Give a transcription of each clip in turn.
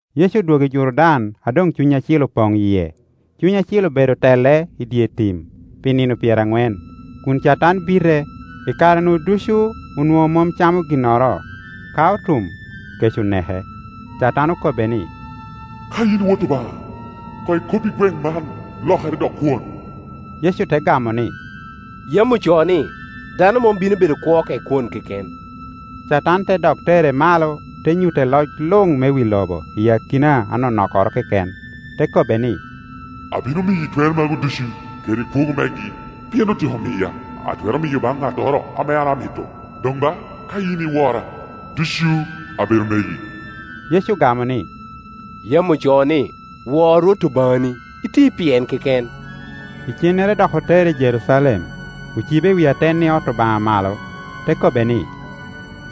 Yecu odwogo i Jordan a doŋ Cuny Acil opoŋ i yie, Cuny Acil obedo tele i dye tim pi nino pyeraŋwen, kun Catan bite, i kare-nu ducu onwoŋo mom camo ginnoro; ka otum, kec oneke. Catan okobbe ni, “Ka yin i Wot Obaŋa, koŋ ikobbi gweŋ man lokere dok kwon.” Yecu te gamo ni, “Yam ocoo ni, ‘Dano mom bino bedo kwo ka i kwon keken.’” Catan te dok tere malo, te nyutte loc luŋ me wi lobo i akina anonokkoro keken, te kobbe ni, “Abino miyi twer magu ducu, kede kwogo megi, pien otyeko miya, atwero miyo baŋ ŋattoro ame an amito. Doŋ ba, ka yin iwora, ducu abedo megi.” Yecu ogamo ni, “Yam ocoo ni, ‘Wor Rwot Obaŋani, iti pi en keken.’” Icennere dok otere i Jerucalem, ocibe i wi atenni ot Obaŋa malo, te kobbe ni,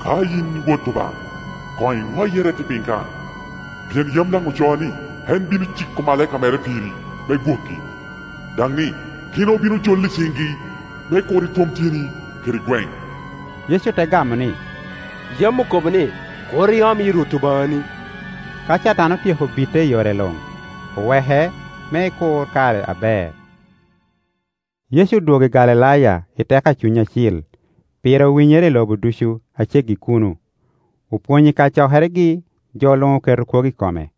“Ka yin i Wot Obaŋa, koŋ iŋoye irette piny kan, pien yam daŋ ocoo ni, ‘En bino ciko omalaika mere piri, me gwoki,’ daŋ ni, ‘Gin obino joli i ciŋi, me kur itwom tyeni kede gweŋ.’” Yecu te gamo ni, “Yam okobo ni, ‘Kur iom yi Rwot Obaŋani.’” Ka Catan otyeko bite i yore luŋ, oweke me ekur kare aber. Yecu odwogo i Galilaya i teko a Cuny Acil; pire owinyere i lobo ducu a ceggi i kuno. Opwonyo i kacokeregi, jo luŋ oketo kwogo i kome.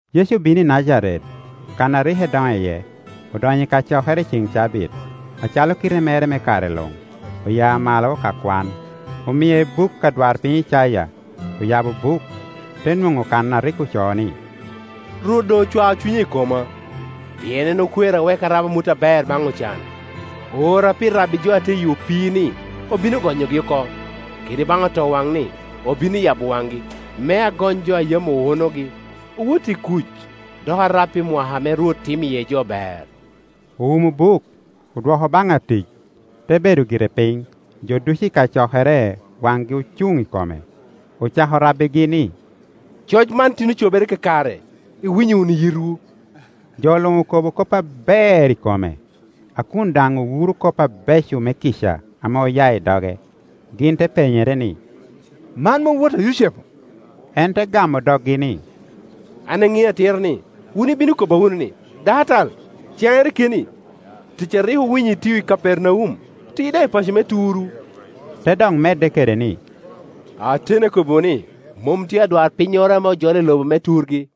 Yecu obino i Najaret, kan a rik edoŋo iye, odonyo i kacokere i ceŋ cabit, acalo kite mere me kare luŋ, oya malo ka kwan. Omie buk adwarpiny Icaya. Oyabo buk, te nwoŋo kan a rik ocoo ni. “Rwot doŋ ocwao Cunye i koma, pien en okwera wek arab amut aber baŋ ocan, Oora pi rabbi jo a tye i opii ni obino gonyogi oko, kede baŋ otowaŋ ni obino yabo waŋgi; me agony jo a yam owunogi, owot i kuc; dok arab pi mwaka ame Rwot timo iye jo ber.” Owumo buk, odwoko baŋ atic, te bedo gire piny; jo ducu i kacokere waŋgi ocuŋ i kome. Ocako rabbigi ni, “Coc man tin ocobere kakare, iwinyo wunu i yitwu.” Jo luŋ okobo kop aber i kome, a kun daŋ owuro kop abeco me kica ame oya i doge. Gin te penyere ni “Man mom wot a Yucepu?” En te gamo doggi ni, “An aŋeo atira ni, wun ibino kobba wunu ni, ‘Dakatal caŋere keni; tic a rik owinyo itio i Kapernaum, ti daŋ i paco me turu.’” Te dok medde kede ni, “Ateni, akobbiwu ni, mom tye adwarpinnyoro ame ojolo i loba me turgi.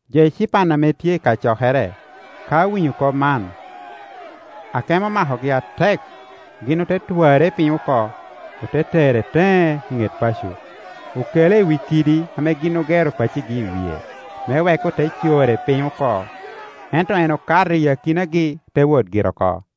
Jo ecipan ame tye i kacokere, ka owinyo kop man, akemo omakogi atek. Gin ote twarre i piny oko, ote tere teŋe i ŋet paco, okele i wi kidi ame gin ogero pacogi i wie, me wek ote core piny oko. Ento en okato i akinagi, te wot gire oko.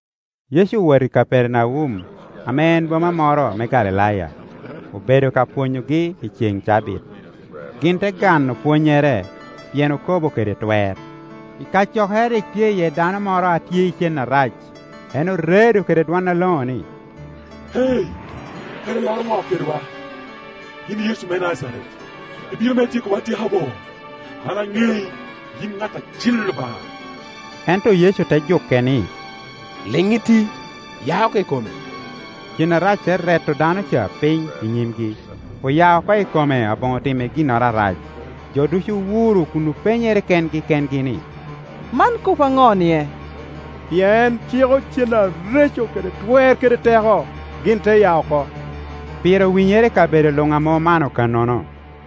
Yecu owoto i Kapernaum, ame en boma moro me Galilaya; obedo ka pwonyogi i ceŋ cabit. Gin te gano pwonnyere, pien okobo kede twer. I kacokere rik tye iye dano moro a tye i cen arac; en oredo kede dwon aloŋo ni, “Eeei, kara ilaro ŋo kedwa, yin Yecu me Najaret? Ibino me tyekowa atyeka bo? An aŋei, yin i ŋat Acil Obaŋa.” Ento Yecu te juke ni, “Liŋ iti, ya oko i kome.” Cen arac te reto dano ca piny i nyimgi, oya oko i kome aboŋo timme ginnoro arac. Jo ducu owuro kun openyere kengi kengi ni, “Man kop aŋo-nie? Pien en ciko cen areco kede twer kede teko, gin te ya oko.” Pire owinyere i kabedo luŋ ame omano kannono.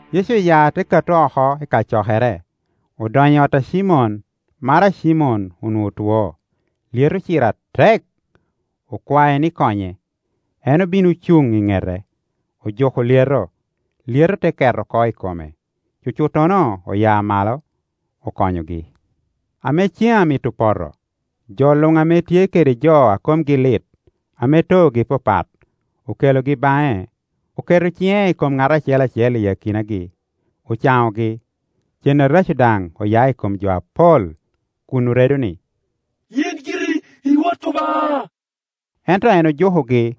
Yecu oya te kato oko i kacokere, odonyo i ot a Cimon. Maro a Cimon onwoŋo two, lyeto ociro atek; okwae ni konye. En obino ocuŋ i ŋete, ojuko lyeto, lyeto te ket oko i kome; cucuttono oya malo, okonyogi. Ame cen amito poto, jo luŋ ame tye kede jo a komgi lit, ame toogi papat, okelogi baŋe; oketo ciŋe i kom ŋat acel acel i akinagi, ocaŋogi. Cen areco daŋ oya i kom jo apol, kun oredo ni, “In giri i Wot Obaŋa!” Ento en ojukogi,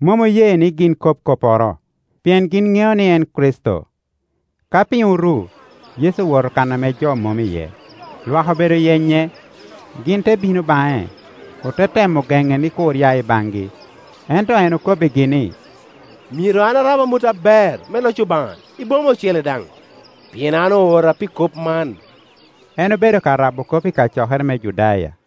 mom oye ni gin kob kopporo, pien gin ŋeo ni en Kricito. Ka piny oru, Yecu owoto kan ame jo mom iye. Lwak obedo yenye, gin te bino baŋe, ote temo gene ni kur ya i baŋgi. Ento en okobbigi ni, “Myero an arab amut aber me loc Obaŋa i boma ocele daŋ, pien an oora pi kop man.” En obedo ka rabo kop ikacokere me Judaya.